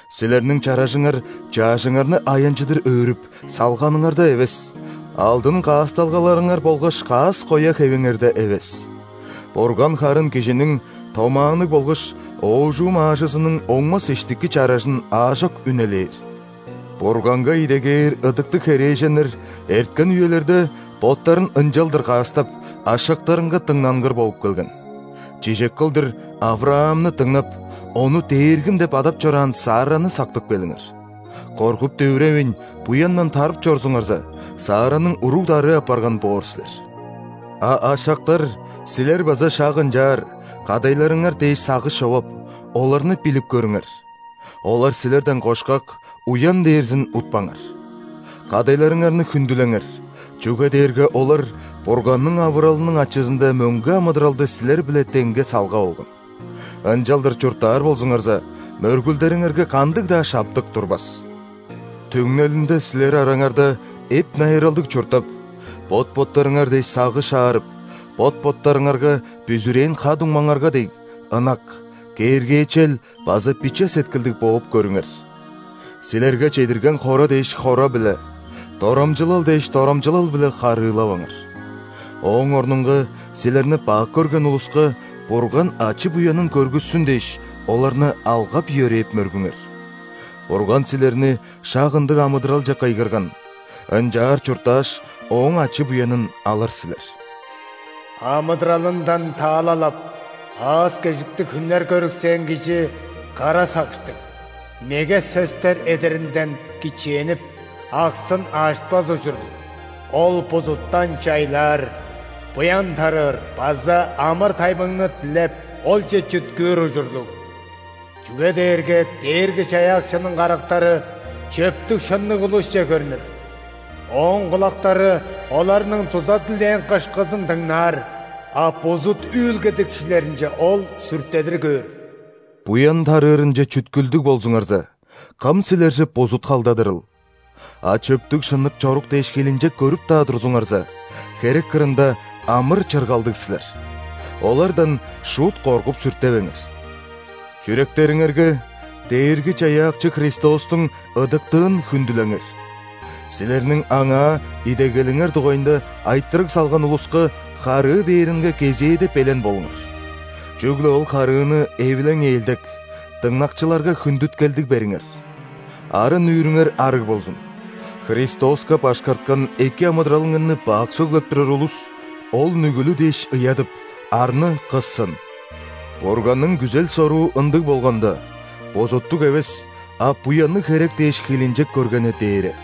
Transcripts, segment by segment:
Силерниң чаражыңар чаъжыңарны аянчыдыр өрүп, салганыңарда эвес, алдын каасталгаларыңар болгаш каас-коя хевиңерде эвес. Бурган харын кижиниң томаанныг болгаш оожум аажызының оңмас иштики чаражын аажок үнелээр. Бурганга идегээр ыдыктыг херээженнер эрткен үелерде боттарын ынчалдыр каастап, ашактарынга дыңнангыр болуп келген. Чижек кылдыр, ·Авраамны дыңнап, ону «дээргим» деп адап чораан Сарраны сактып келиңер. Коргуп-дүвүревейн, буяндан тарып чорзуңарза, Сарраның уруг-дарыы апарган боор силер. А ашактар силер, база шак ынчаар, кадайларыңар дээш сагыш човап, оларны билип көрүңер: олар силерден кошкак, уян дээрзин утпаңар. Кадайларыңарны хүндүлеңер, чүге дээрге олар Бурганның авыралының ачызында мөңге амыдыралды силер-биле деңге салгап алган. Ынчалдыр чурттаар болзуңарза, мөргүлдериңерге кандыг-даа шаптык турбас. Түңнелинде силер араңарда эп-найыралдыг чурттап, бот-боттарыңар дээш сагыш аарып, бот-боттарыңарга, бүзүрээн ха-дуңмаңарга дег, ынак, кээргээчел база биче сеткилдиг бооп көрүңер. Силерге чедирген хора дээш хора-биле, дорамчылал дээш дорамчылал-биле харыылаваңар. Ооң орнунга силерни бак көрген улуска Бурган ачы-буянын көргүссүн дээш, оларны алгап-йөрээп мөргүңер. Бурган силерни шак ындыг амыдыралче кыйгырган, ынчаар чурттааш, Ооң ачы-буянын алыр силер. Амыдыралындан таалал ап, аас-кежиктиг хүннер көрүксээн кижикара сагыштыг, меге сөстер эдеринден кичээнип,аксын ажытпас ужурлуг. Ол бузуттан чайлаар, буян тарыыр базаамыр-тайбыңны дилеп, олче чүткүүр ужурлуг. Чүге дээрге Дээрги-Чаяакчының карактары чөптүг-шынныг улусче көрнүр,Ооң кулактары оларның дуза дилээн кышкызын дыңнаар,а бузут үүлгедикчилеринче Ол сүртедир көөр. Буян тарыырынче чүткүлдүг болзуңарза, кым силерже бузут халдадырыл? А чөптүг-шынныг чорук дээш хилинчек көрүп-даа турзуңарза, херек кырында амыр-чыргалдыг силер. Олардан шуут коргуп-сүртевеңер. Чүректериңерге Дээрги-Чаяакчы Христостуң ыдыктыын хүндүлеңер. Силерниң Аңаа идегелиңер дугайында айтырыг салган улуска харыы бээринге кезээде белен болуңар. Чүгле ол харыыны эвилең-ээлдек, дыңнакчыларга хүндүткелдиг бериңер. Арын-нүүрүңер арыг болзун: Христоска башкарткан эки амыдыралыңарны бак сөглеп турар улус, ол нүгүлү дээш ыядып, арны кыссын. Бурганның күзел-соруу ындыг болганда, бузуттуг эвес, а буянныг херек дээш хилинчек көргени дээре.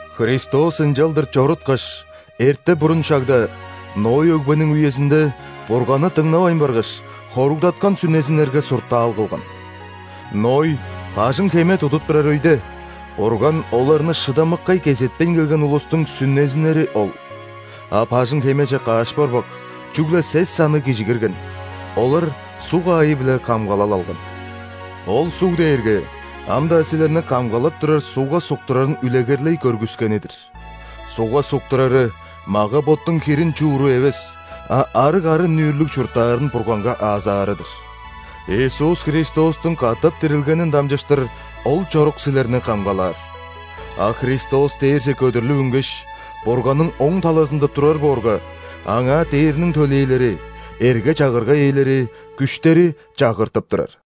Христос ынчалдыр чоруткаш, эрте-бурун шагда – Ной өгбениң үезинде Бурганны дыңнавайн баргаш, хоругдаткан сүнезиннерге суртаал кылган. Ной бажың-хеме тудуп турар өйде, Бурган оларны шыдамыккай кезетпейн келген улустуң сүнезиннери ол. А бажың-хемеже каш борбак, чүгле сес санныг кижи кирген, олар суг аайы-биле камгалал алган. Ол суг дээрге ам-даа силерни камгалап турар ·сугга суктурарын үлегерлей көргүскени-дир. Сугга суктурары – мага-боттуң хирин чууру эвес, а арыг арын-нүүрлүг чурттаарын Бурганга аазаары-дыр. Иисус Христостуң катап дирилгенин дамчыштыр ол чорук силерни камгалаар. А Христос дээрже көдүрлүп үнгеш, Бурганның оң талазында турар боорга, Аңаа ·дээрниң төлээлери, эрге-чагырга ээлери, күштери чагыртып турар.